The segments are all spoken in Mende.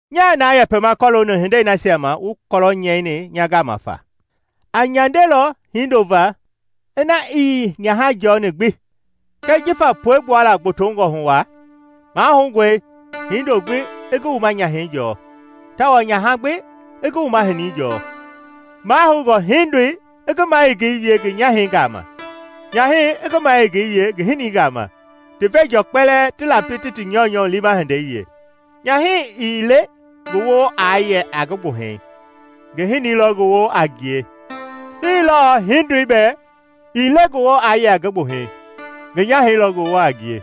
Nyaa na yɛpɛma kɔlooni hindei nasia ma wu kɔlɔ nyɛini nya gama fa. A nyandelɔ hindo va ina ii nyaha jɔni gbi. Kɛɛ jifa puegbua la gbotongɔ hu waa, mahoungɔe hindo gbi i ngi wuma nyahɛi jɔɔ, tawao nyaha gbi i ngi wuma hinii jɔɔ. Mahoungɔ hindoi i ngi mayengei wie ngi nyahɛi gama, nyahɛi i ngi mayengei wie ngi hinii gama, ti veenjɔɔ kpɛlɛɛ ti lapi ti ti nyɔunyɔ liima hindei wie. Nyahɛi ii le ngi woo aa yɛ a ngi gbuhɛi, ngi hinii lɔ ngi woo a ngie; hii lɔɔ hindoi bɛɛ ii le ngi woo aa yɛ a ngi gbuhɛi, ngi nyahɛi lɔ ngi woo a ngie.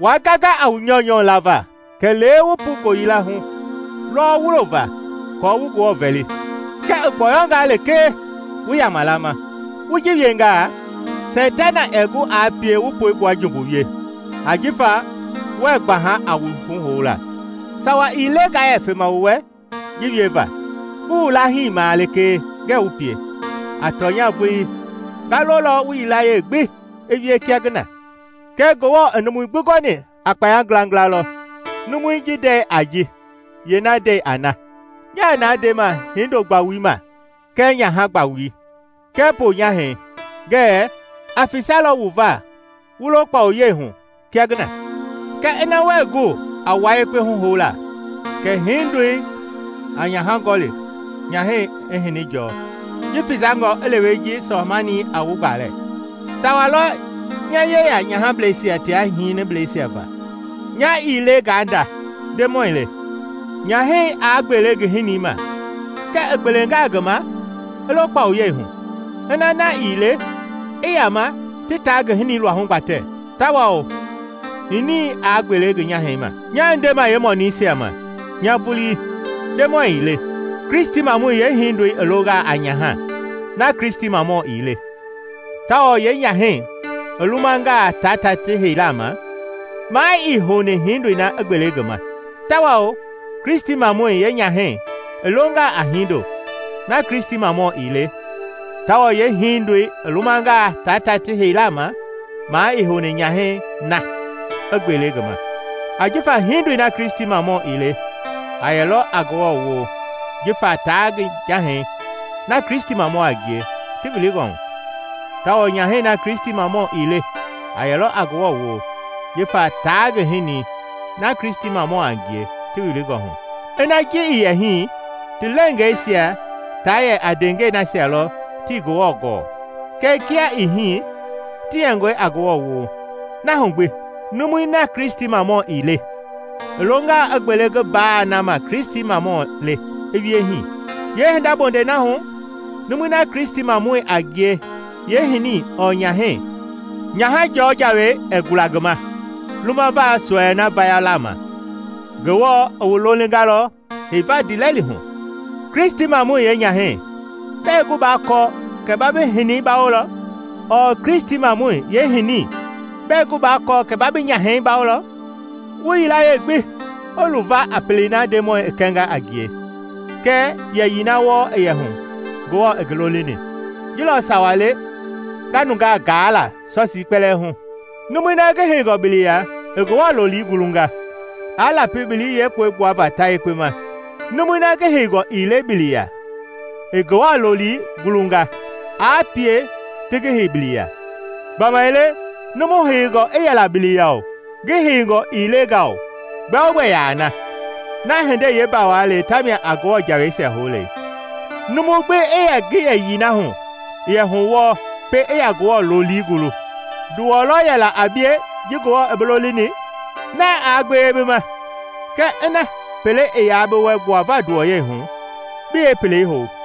Waa ganga a wu nyɔunyɔ lava kɛlee wu pu ngooyila hu lɔwɔ wulo va aako wu Ngewɔ vɛli; kɛɛ i gbɔyɔngaa lekee wu yama lama. Wu ji wiengaa Seitana ɛɛ gu aa pie waa puegbua jumbu wie ajifa wue gbaha a wu huhoula. Sawa ii le ngaa yɛ fema wu wɛ ji wieva; ngi wu laahimaa lekee ngɛɛ wu pie. A tɔnya vulii ngaa lolɔ wu yilayee gbi i wie kia ngi na, kɛɛ Ngewɔ i numui gbi gɔni a kpaya ngilangila lɔ, numui ji ndɛi a ji, yeena ndɛi a na. Nyaa na ndema hindo-gbawui ma kɛɛ nyaha gbawui, kɛɛ ponyahɛi ngɛɛ a fesalɔ wu va wu lo kpawuyei hu kia ngi na. Kɛɛ ina wuɛɛ gu a wua yekpe huhoula kɛ hindoi i nyaha gɔli, nyahɛi i hini jɔɔ. Ji fesangɔ i lewe ji sɔɔ-manii a wu gbalɛ. Sawa lɔ nya yeya nyahableisia tia hinibleisia va, nya ii le ngaa nda, Ndemɔi le. Nyahɛi aa gbele ngi hinii ma, kɛɛ i gbelenga ngi ma, i lo kpawuyei hu, ina na ii le, i yama ti taa ngi hinii luahu gbatɛ tawao hinii aa gbele ngi nyahɛi ma. Nyaa ndema yeemɔniisia ma, nya vulii, Ndemɔi ii le, Kristimamɔi yeehindoi i longaa a nyaha na Kristimamɔ ii le, tawao yeenyahɛi i lumangaa taa ta ti heilaa ma, maa ii houni hiindoi na i gbele ngi ma. Tawao Kristimamɔi yeenyahɛi i longaa a hindo na Kristimamɔ ii le, tawao yeehindoi i lumangaa taa ta ti heilaa ma, maa ii houni nyahɛi na i gbele ngi ma. Ajifa hindoi na Kristimamɔ ii le a yɛlɔ a Ngewɔ woo jifa taa ngi nyahɛi na Kristimamɔ a ngie ti wilingɔ hu, tawao nyahɛi na Kristimamɔ ii le a yɛlɔ a Ngewɔ woo jifa taa ngi hinii na Kristimamɔ a ngie ti wilingɔ hu. Ina ji ii yɛ hii, ti leengeisia taa yɛ a ndeengɛi nasia lɔ tii Ngewɔ gɔɔ; kɛɛ kia i hii, ti yɛngɔe a Ngewɔ woo. Na hu gbi, numui na Kristimamɔ ii le i longaa i gbele ngi mbaa na ma Kristimamɔ le, i wie hii. Yeehinda bondɛi na hu, numui na Kristimamɔi a ngie yeehinii ɔɔ nyahɛi, nyaha-jɔɔ jawei ɛɛ gula ngi ma lumava sɔɛi na vayala ma. Ngewɔ i wu lolingalɔ heiva ndiilɛli hu. Kristimamɔi yeenyahɛi, bɛɛ gu baa kɔɔ kɛ ba bi hinii bawolɔ? Ɔɔ Kristimamɔi yeehinii, bɛɛ gu baa kɔɔ kɛ ba bi hinii bawolɔ? Wu yilayee gbi i luva a pelei na Ndemɔi i kɛnga a ngie kɛɛ yɛyii na wɔɔ i yɛ hu Ngewɔ i ngi lolini. Ji lɔ sawa le nga nungaa gaa la sɔsii kpɛlɛɛ hu. Numui na ngi heingɔ biliya i Ngewɔ loli gulungaa, aa lapi bili yeekpoi gbuava ta yekpe ma; numui na ngi heingɔ ii le bili ya i Ngewɔ lolii gulungaa, aa pie ti ngi hei bili ya. Gbamaile numu heingɔ i yɛla bili ya-o, ngi heingɔ ii le nga-o, gbɛogbɛ yaa na; na hindei yeembawa le tamia a Ngewɔ jaweisia houle. Numu gbi i yɛ ngi yɛyii na hu i yɛ hu wɔɔ pɛiŋ i yaa Ngewɔ loli gulu. Nduwɔ lɔ yɛla a bie ji Ngewɔ i bi lolini? Na aa gbewe bi ma, kɛɛ ina pele i yaa bi wɛ gbuava nduwɔyɛihu, bi yeepelei hou.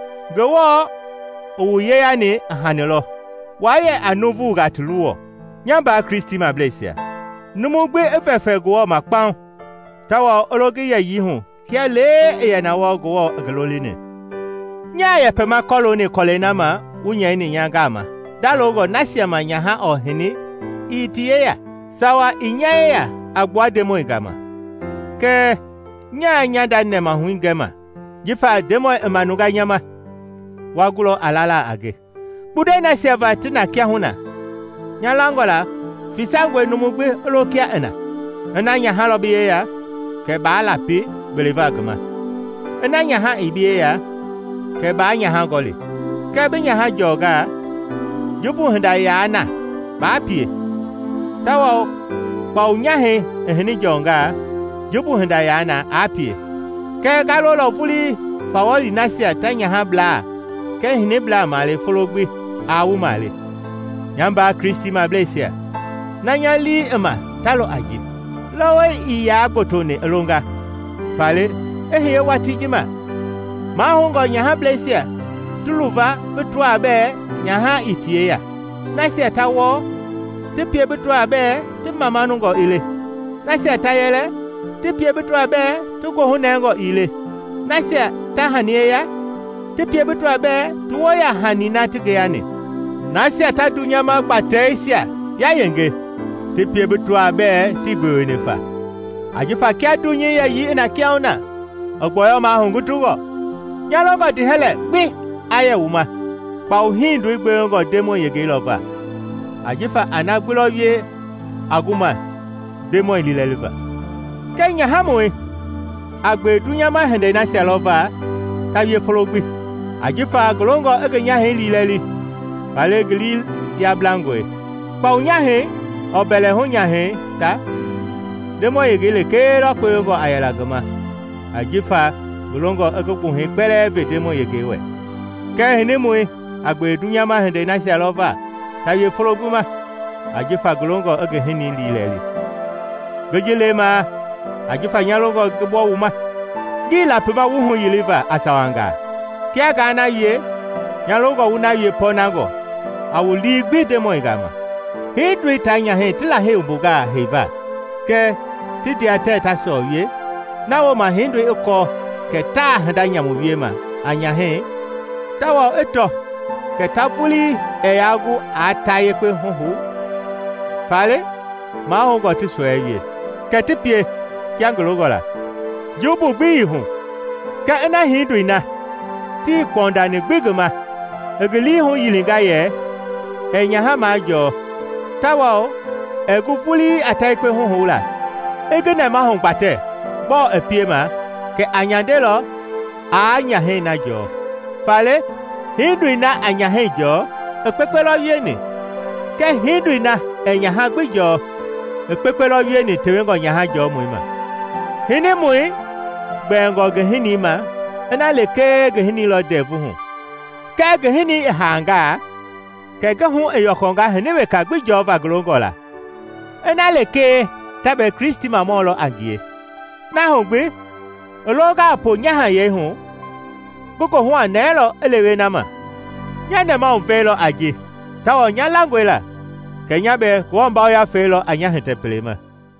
Ngewɔ i wu yeyani a hani lɔ, waa yɛ a nuuvungaa ti luwɔ. Nya mbaa Kristimableisia, numu gbi i vɛfɛ Ngewɔ ma kpaŋ tawao i lo ngi yɛyii hu kia lee i yɛ na wɔɔ Ngewɔ i ngi lolini. Nyaa na yɛpɛma kɔlooni kɔlɛi na ma wu nyɛini nya gama ndalongɔ nasia ma nyaha ɔɔ hini ii ti yeya. Sawa ii nya yeya a gbua Ndemɔi gama kɛɛ nyaa nya nda nɛmahui gɛma jifa Ndemɔi i manunga nya ma, wa gulɔ a lala a nge. Kpundɛi nasia va ti na kiahuna, nya langɔ la fesangɔe numu gbi i lo kia i na. Ina nyaha lɔ bi yeya, kɛ baa lapi gbeleva ngi ma. Ina nyaha ii bi yeya; kɛ baa nyaha gɔli. Kɛɛ bi nyaha jɔnga, jumbu hinda yaa na baa pie; tawao kpawu nyahɛi i hini jɔngaa, jumbu hinda yaa na aa pie. Kɛɛ ngaa lolɔ vulii fawɔli nasia ta nyahablaa kɛɛ hiniblaa male folo gbi aa wu male. Nya mbaa Kristimableisia, na nya lii i ma ta lɔ a ji: lɔwɔi ii yaa gbotoni i longa, faale, i hiye watii ji ma mahoungɔ nyahableisia ti luva bi tɔaa bɛɛ nyaha ii ti yeya; nasia ta wɔɔ, ti pie bi tɔaa bɛɛ ti mamanungɔ ii le; nasia ta yɛlɛ, ti pie bi tɔaa bɛɛ ti goohu nɛngɔ ii le; nasia ta hani yeya, ti pie bi tɔaa bɛɛ ti woo yaa hani na ti ngeyani; nasia ta dunyama gbateisia yayenge, ti pie bi tɔaa bɛɛ tii gbeweni fa. Ajifa kia dunyei yɛyii i na kiahuna, i gbɔyɔmaa hugutungɔ. Nya longɔ ndiihɛlɛ gbi aa yɛ wu ma. Kpawu hindoi gbewengɔ Ndemɔi yengei lɔ va, ajifa a na gbi lɔ wie a gu ma Ndemɔi liilɛliva. Kɛɛ nyahamɔi a gbewe dunyama hindei nasia lɔ va ta wie folo gbi, ajifa ngi longɔ i ngi nyahɛi liilɛli; faale ngi lii yablangɔe. Kpawu nyahɛi ɔɔ mbɛlɛhu nyahɛi ta, Ndemɔi yengei lekee lɔ kpewengɔ a yɛla ngi ma ajifa ngi longɔ i ngi gbuhɛi kpɛlɛɛ ve Ndemɔi yengei wɛ; kɛɛ hinimɔi a gbewe dunyama hindei nasia lɔ va ta wie folo gbi ajifa ngi longɔ i ngi hinii liilɛli. Ngi ji lemaa ajifa nya longɔ ngi gbɔ wu ma. Ngii lapima wu huyiliva a sawangaa. Kia ngaa na wie, nya longɔ wu na wie pɔɔnangɔ, a wu lii gbi Ndemɔi gama. Hindoi taa nyahɛi ti Lahei wumbungaa heiva kɛɛ ti ndea tɛɛ taa sɔɔ wie, na wooma hindoi i kɔɔ kɛ taa hinda nyamu wiema a nyahɛi tawao i tɔ kɛ ta vulii ɛɛ yaa gu a ta yekpe huhoula faale mahoungɔ ti sɔɛi wie, kɛ ti pie, kia ngi longɔ la. Jumbu gbi ii ji hu. Kɛɛ ina hindoi na, tii kpɔndani gbi ngi ma, i ngi lii huyilinga yɛ ɛɛ nyaha majɔɔ tawao i gu vulii a ta yekpe huhoula, i ngi nɛmahu gbatɛ gbɔɔ i piema, kɛ a nyandelɔ aa nyahɛi na jɔɔ. Faale hindoi na a nyahɛi jɔɔ, i kpekpe lɔ wieni; kɛɛ hindoi na ɛɛ nyaha gbi jɔɔ i kpekpe lɔ wieni tewengɔ nyaha-jɔmɔi ma. Hinimɔi gbɛɛngɔ ngi hini ma ina lekee ngi hini lɔ ndɛvu hu. Kɛɛ ngi hinii i haangaa, kɛ ngi hu i yɔkɔnga hini weka gbi jɔva ngi longɔ la, ina lekee ta bɛɛ Kristimamɔ lɔ a ngie. Na hu gbi, i longaa ponyahayɛi hu ngi goohu a nɛɛlɔ i lewe na ma. Nya nɛmahuvɛi lɔ a ji tawao nya langɔe la kɛ nya bɛɛ Ngewɔ Yafei lɔ a nya hitɛ pele ma.